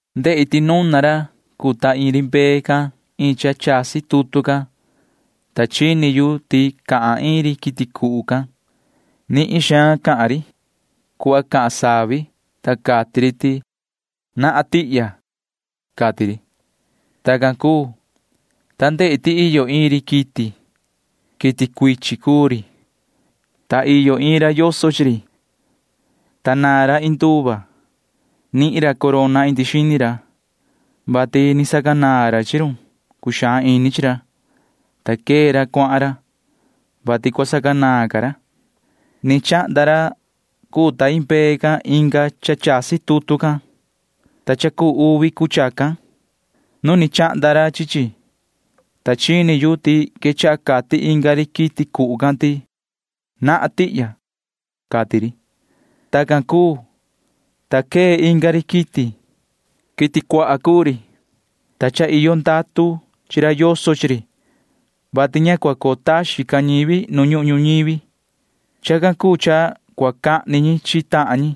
Ndehi ti nuna ra cuu ta iin ri mbee can iin cha chasi tutu can, ta chini yu ti cahan iin ri quiti cuhu can. Nihin suhva cahan ri cuhva cahan savi, ta cati ri ti: ―¡Nahan tihya! ―cati ri. Tacan cuu, ta ndehi ti iyo iin ri quiti. Quiti cuichin cuu ri, ta iyo iin ra yoso chi ri, ta naan ra cuchi. Nihin ra corona indi xini ra, vati ni sacanaan ra chi run cuxaan ini chi ra, ta quee ra cuahan ra, vati cua sacanaan ca ra. Ni chahnda ra cuu ta iin mbee can inga cha chasi tutu can, ta cha cuu uvi cuu chacan. Nu ni chahnda ra chi chi, ta chini yu ti quechaha cati inga ri quiti cuhu can ti: ―¡Nahan tihya! ―cati ri. Tacan cuu, ta quee inga ri quiti. Quiti cuaha cuu ri, ta cha iyo ndatu chi ra yoso chi ri, vati ña cua coo taxin ca ñivi nu ñuhun ñuñivi. Chacan cuu cha cua cahni ñi chi tahan ñi,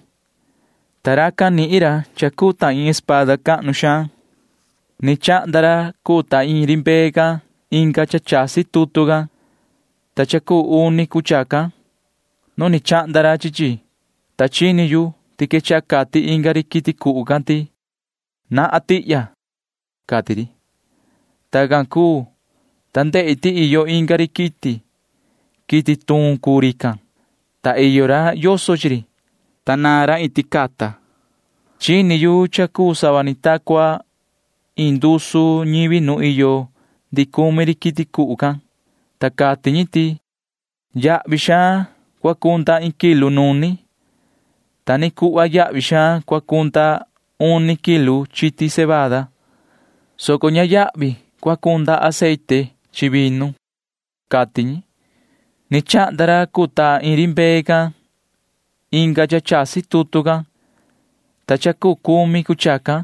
ta racan nihin ra cha cuu ta iin machete cahnu xaan. Ni chahnda ra cuu ta iin ri mbee can inga cha chasi tutu can, ta cha cuu uni cuu chacan. Nu ni chahnda ra chi chi, ta chini yu ti quechaha cati inga ri quiti cuhu can ti: ―¡Nahan tihya! ―cati ri. Tacan cuu, ta ndehi ti iyo inga ri quiti. Quiti tuun cuu rican, ta iyo ra yoso chi ri, ta naan ra iin ticata. Chini yu cha cuu sava ni ta cua iin ndusu ñivi nu iyo ndihi cumi ri quiti cuhu can, ta cati ñi ti: ―Yahvi xaan cua cunda iin kilu nuni, ta ta ni cuhva yahvi xaan cua cunda uni kilu chiti cebada, soco ña yahvi cua cunda aceite chi vinu ―cati ñi. Ni chahnda ra cuu ta iin ri mbee can inga cha chasi tutu can, ta cha cuu cumi cuu chacan.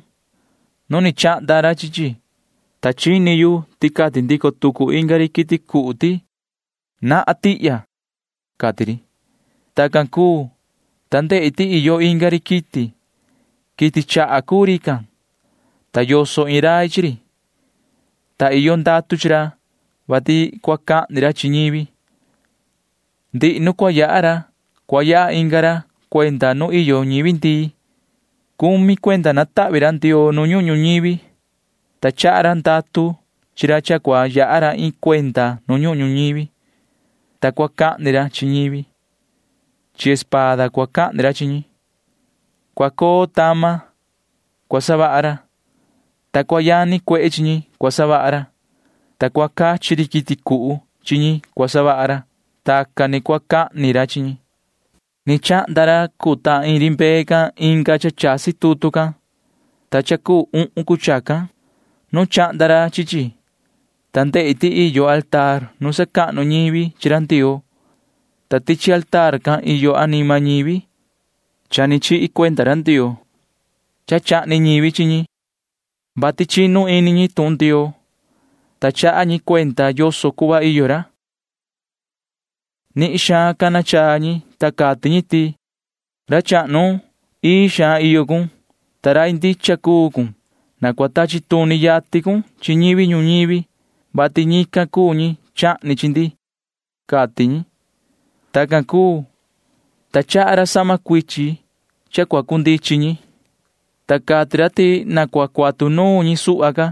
Nu ni chahnda ra chi chi, ta chini yu ti cati ndico tucu inga ri quiti cuhu ti: ―¡Nahan tihya! ―cati ri. Tacan cuu, ta ndehi ti iyo inga ri quiti. Quiti chaha cuu rican, ta yoso iin rai chi ri, ta iyo ndatu chi ra, vati cua cahni ra chi ñivi. Ndihi nu cua yaha ra cua yaha inga ra cuenda nu iyo ñivi ndii. Cumi cuenda natahvi ra Ndioo nu ñuhun ñuñivi, ta chaha ra ndatu chi ra cha cua yaha ra iin cuenda nu ñuhun ñuñivi, ta cua cahni ra chi ñivi. Chi espada cua cahni ra chi ñi. Cua coo tama cua savaha ra, ta cua yani cuehe chi ñi cua savaha ra, ta cua cachi ri quiti cuhu chi ñi cua savaha ra. Tacan ni cua cahni ra chi ñi. Ni chahnda ra cuu ta iin ri mbee can inga cha chasi tutu can, ta cha cuu uhun cuu chacan. Nu chahnda ra chi chi, ta ndehi ti iyo mesa nu sacahnu ñivi chi ra Ndioo, ta tichi mesa can iyo anima ñivi ni chihi cuenda ra Ndioo. Chahni ñivi chi ñi, vati chinu ini ñi tuhun Ndioo, ta chaha ñi cuenda yoso cuhva iyo ra. Nihin xaan cana chaa ñi, ta cati ñi ti: ―Yoho ra chahnu, ii xaan iyo cun, ta rai ndicha cuu cun. Na cua tachi tuni yatin cun chi ñivi ñuñivi, vati ñican cuu ñi chahni chi ndi ―cati ñi. Tacan cuu, ta chaha ra sahma cuichin cua cundichin ñi, ta cati ra ti na cua cuatu nuun ñi suhva ca,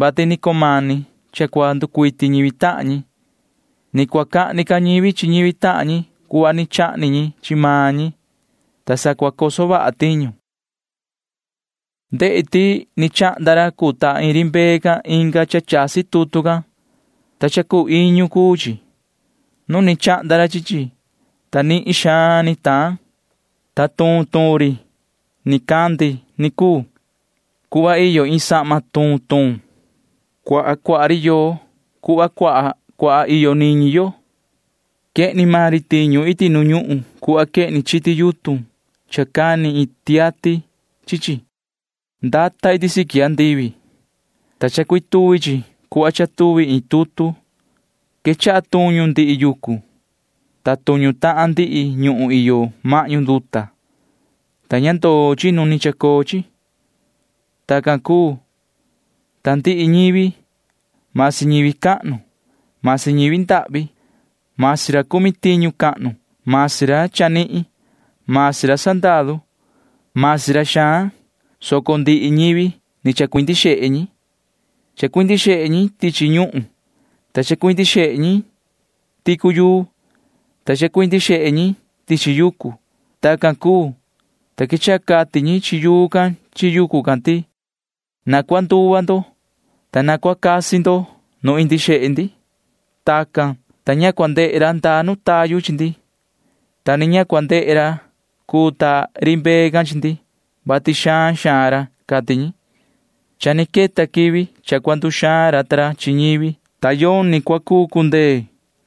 vati ni cumani cha cua nducuiti ñivi tahan ñi. Ni cua cahni ca ñivi chi ñivi tahan ñi cuhva ni chahni ñi chi maan ñi, ta sa cua coso vaha tiñu. Ndehi ti ni chahnda ra cuu ta ri mbee can inga cha chasi tutu can, ta cha cuu iñu cuu chi. Nu ni chahnda ra chi chi, ta nihin xaan ni taan, ta tuun tuun ni chacoo ri nicandi cuhva iyo iin sahma tuun tuun. Cuaha cuaha cuu ri yoo cuhva cuaha cuaha iyo niñi yo. Quehni maan ri tiñu iti nu ñuhun cuhva quehni chiti yutun cha cani iin tiati chi chi. Ndata iti siqui andivi, ta chacuituvi chi cuhva chaituvi iin tutu. Quechaha tuñu ndihi yucu, ta tuñu tahan ndihi ñuhun iyo mahñu nduta, ta ña ndoo chi nu ni chacoo chi. Tacan cuu, ta ndihi ñivi―masi ñivi cahnu, masi ñivi ndahvi, masi ra cumi tiñu cahnu, masi ra chanihin, masi ra sandaru, masi ra xaan, soco ndihi ñivi ni chacuindi xehe ñi. Chacuindi xehe ñi tichi ñuhun, ta chacuindi xehe ñi ticu yuu, ta chacuindi xehe ñi tichi yucu. Tacan cuu, ta quechaha cati ñi chi yuu can chi yucu can ti: ―Na cua nduva ndo, ta na cua casi ndo nu indi xehe ndi. Tacan, ta ña cua ndehe ra ndaa nu tayu chi ndi, ta ni ña cua ndehe ra cuu ta ri mbee can chi ndi, vati xaan xaan ra ―cati ñi. Cha ni queta quivi cha cua nduxaan ra ta ra chi ñivi, ta yoni cua cuu cundee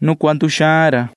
nu cua nduxaan ra.